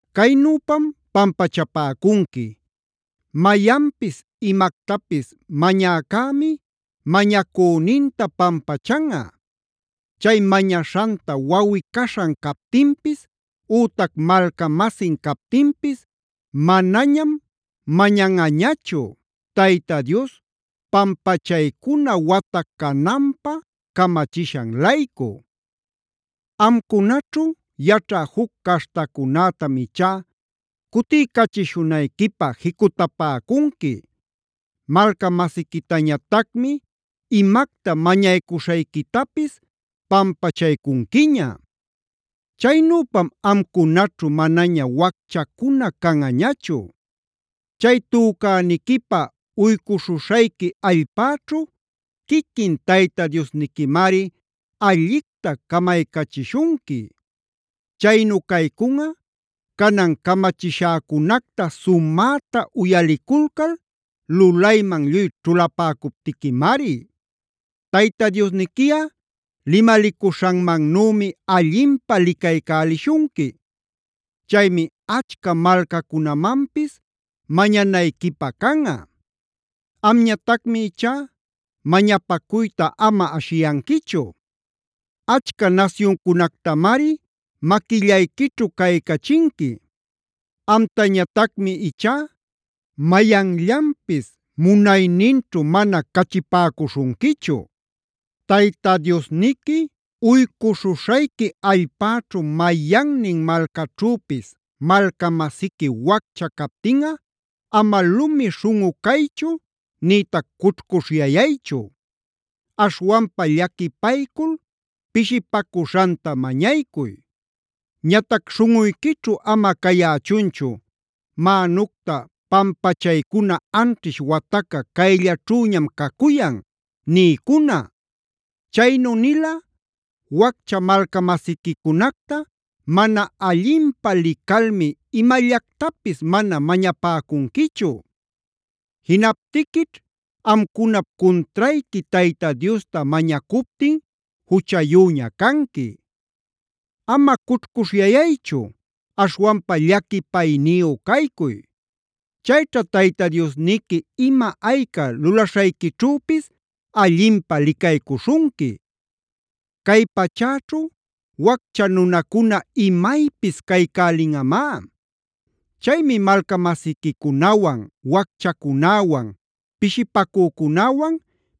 Caynüpam pampachapäcunqui: mayanpis imactapis mañäcämi mañacüninta pampachanꞌa. Chay mañaśhanta wawꞌi-caśhan captinpis, ütac malca-masin captinpis manañam mañanꞌañachu, Tayta Dios pampachaycuna wata cananpä camachishan-laycu. Amcunaćhu yaćhä juc caśhtacunätam ichá cutiycachishunayquipä jicutapäcunqui. Malca-masiquitañatacmi imacta mañaycuśhayquitapis pampachaycunquiña. Chaynüpam amcunaćhu manaña wacchacuna canꞌañachu. Chay tücäniquipä uycuśhuśhayqui allpäćhu quiquin Tayta Diosniquimari allicta camaycachishunqui. Chaynu caycunꞌa canan camachishäcunacta sumäta uyaliculcal lulayman lluy ćhulapäcuptiquimari. Tayta Diosniquiꞌa limalicuśhanmannümi allinpä licaycälishunqui. Chaymi achca malcacunamanpis mañanayquipä canꞌa; amñatacmi ichá mañapacuyta ama ashiyanquichu. Achca nasyuncunactamari maquillayquićhu caycachinqui; amtañatacmi ichá mayanllanpis munayninćhu mana cachipäcuśhunquichu. “Tayta Diosniqui uycuśhuśhayqui allpäćhu mayannin malcaćhüpis malca-masiqui waccha captinꞌa ama lumi śhunꞌu caychu nïtac cućhcuśhyayaychu. Aśhwanpa llaquipaycul pishipacuśhanta mañaycuy.b Ñatac śhunꞌuyquićhu ama cayächunchu: ‘Mänucta pampachaycuna anćhish wataca cayllaćhüñam cacuyan’ niycuna. Chaynu nilꞌa waccha malca-masiquicunacta mana allinpä licalmi imallactapis mana mañapäcunquichu. Jinaptiquićh amcunap cuntrayqui Tayta Diosta mañacuptin juchayüña canqui. Ama cućhcuśhyayaychu, aśhwanpa llaquipayniyu caycuy. Chayćha Tayta Diosniqui ima ayca lulaśhayquićhüpis allinpä licaycuśhunqui. Cay pachäćhu waccha nunacuna imaypis caycälinꞌamá.c Chaymi malca-masiquicunawan, wacchacunäwan, pishipacücunäwan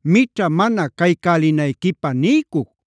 mićha mana caycälinayquipä niycuc.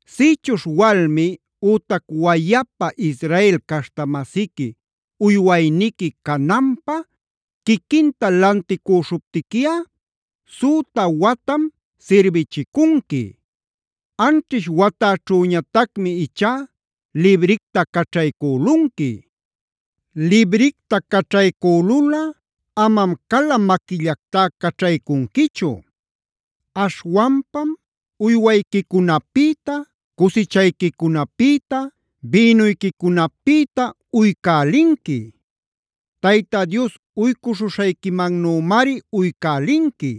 “Sïchuśh walmi ütac wayapa Israel caśhta-masiqui uywayniqui cananpä quiquinta lanticüśhüptiquiꞌad süta watam sirbichicunqui; anćhish watäćhüñatacmi ichá libricta caćhaycülunqui. Libricta caćhaycülulꞌa amam cala maquillactá caćhaycunquichu. Aśhwanpam uywayquicunapïta, cusichayquicunapïta, bïnuyquicunapïta uycälinqui. Tayta Dios uycuśhuśhayquimannümari uycälinqui.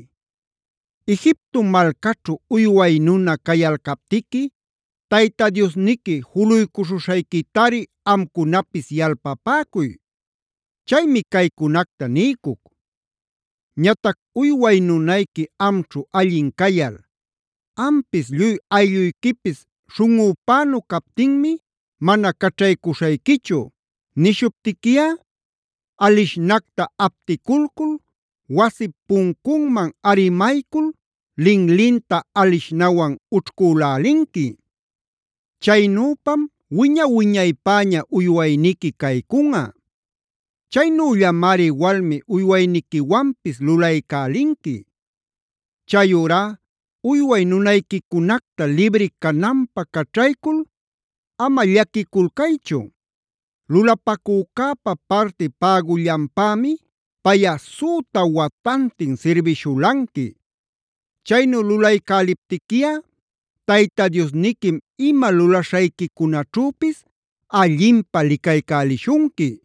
Egipto malcaćhu uyway nuna cayalcaptiqui Tayta Diosniqui juluycuśhuśhayquitari amcunapis yalpapäcuy. Chaymi caycunacta niycuc. “Ñatac uyway nunayqui amćhu allin cayal: ‘Ampis lluy aylluyquipis śhunꞌupänu captinmi mana caćhaycuśhayquichu’ nishuptiquiꞌa, alishnacta apticulcul wasip puncunman arimaycul linlinta alishnawan ućhcülälinqui. Chaynüpam wiña-wiñaypäña uywayniqui caycunꞌa. Chaynüllamari walmi uywayniquiwanpis lulaycälinqui. Chayurá uyway nunayquicunacta libri cananpä caćhaycul ama llaquiculcaychu. Lulapacücäpa parti pägullanpämi payꞌa süta watantin sirbishulanqui. Chaynu lulaycäliptiquiꞌa Tayta Diosniquim ima lulaśhayquicunaćhüpis allinpä licaycälishunqui.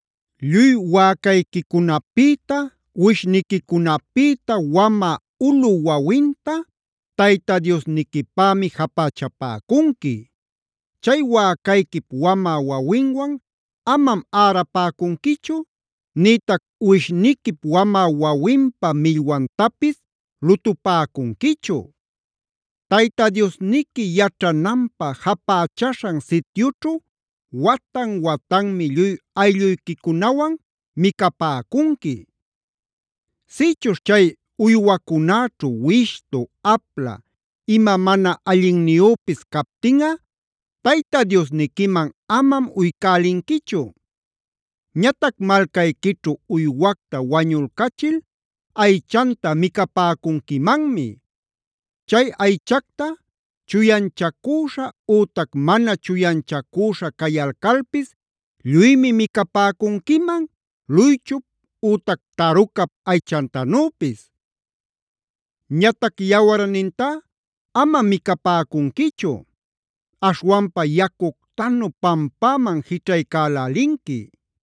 “Lluy wäcayquicunapïta, uwishniquicunapïta wamä ulu wawinta Tayta Diosniquipämi japächapäcunqui.e “Chay wäcayquip wamä wawinwan amam ärapäcunquichu, nïtac uwishniquip wamä wawinpa millwantapis lutupäcunquichu. Tayta Diosniqui yaćhananpä japächaśhan sityućhu watan-watanmi lluy aylluyquicunawan micapäcunqui. Sïchuśh chay uywacunäćhu wishtu, apla, ima mana allinniyüpis captinꞌa Tayta Diosniquiman amam uycälinquichu. Ñatac malcayquićhu uywacta wañulcachil aychanta micapäcunquimanmi. Chay aychacta chuyanchacüśha ütac mana chuyanchacüśha cayalcalpis lluymi micapäcunquiman luychup ütac tarucap aychantanüpis. Ñatac yawarnintá amam micapäcunquichu,f aśhwanpa yacuctanu pampäman jićhaycälälinqui.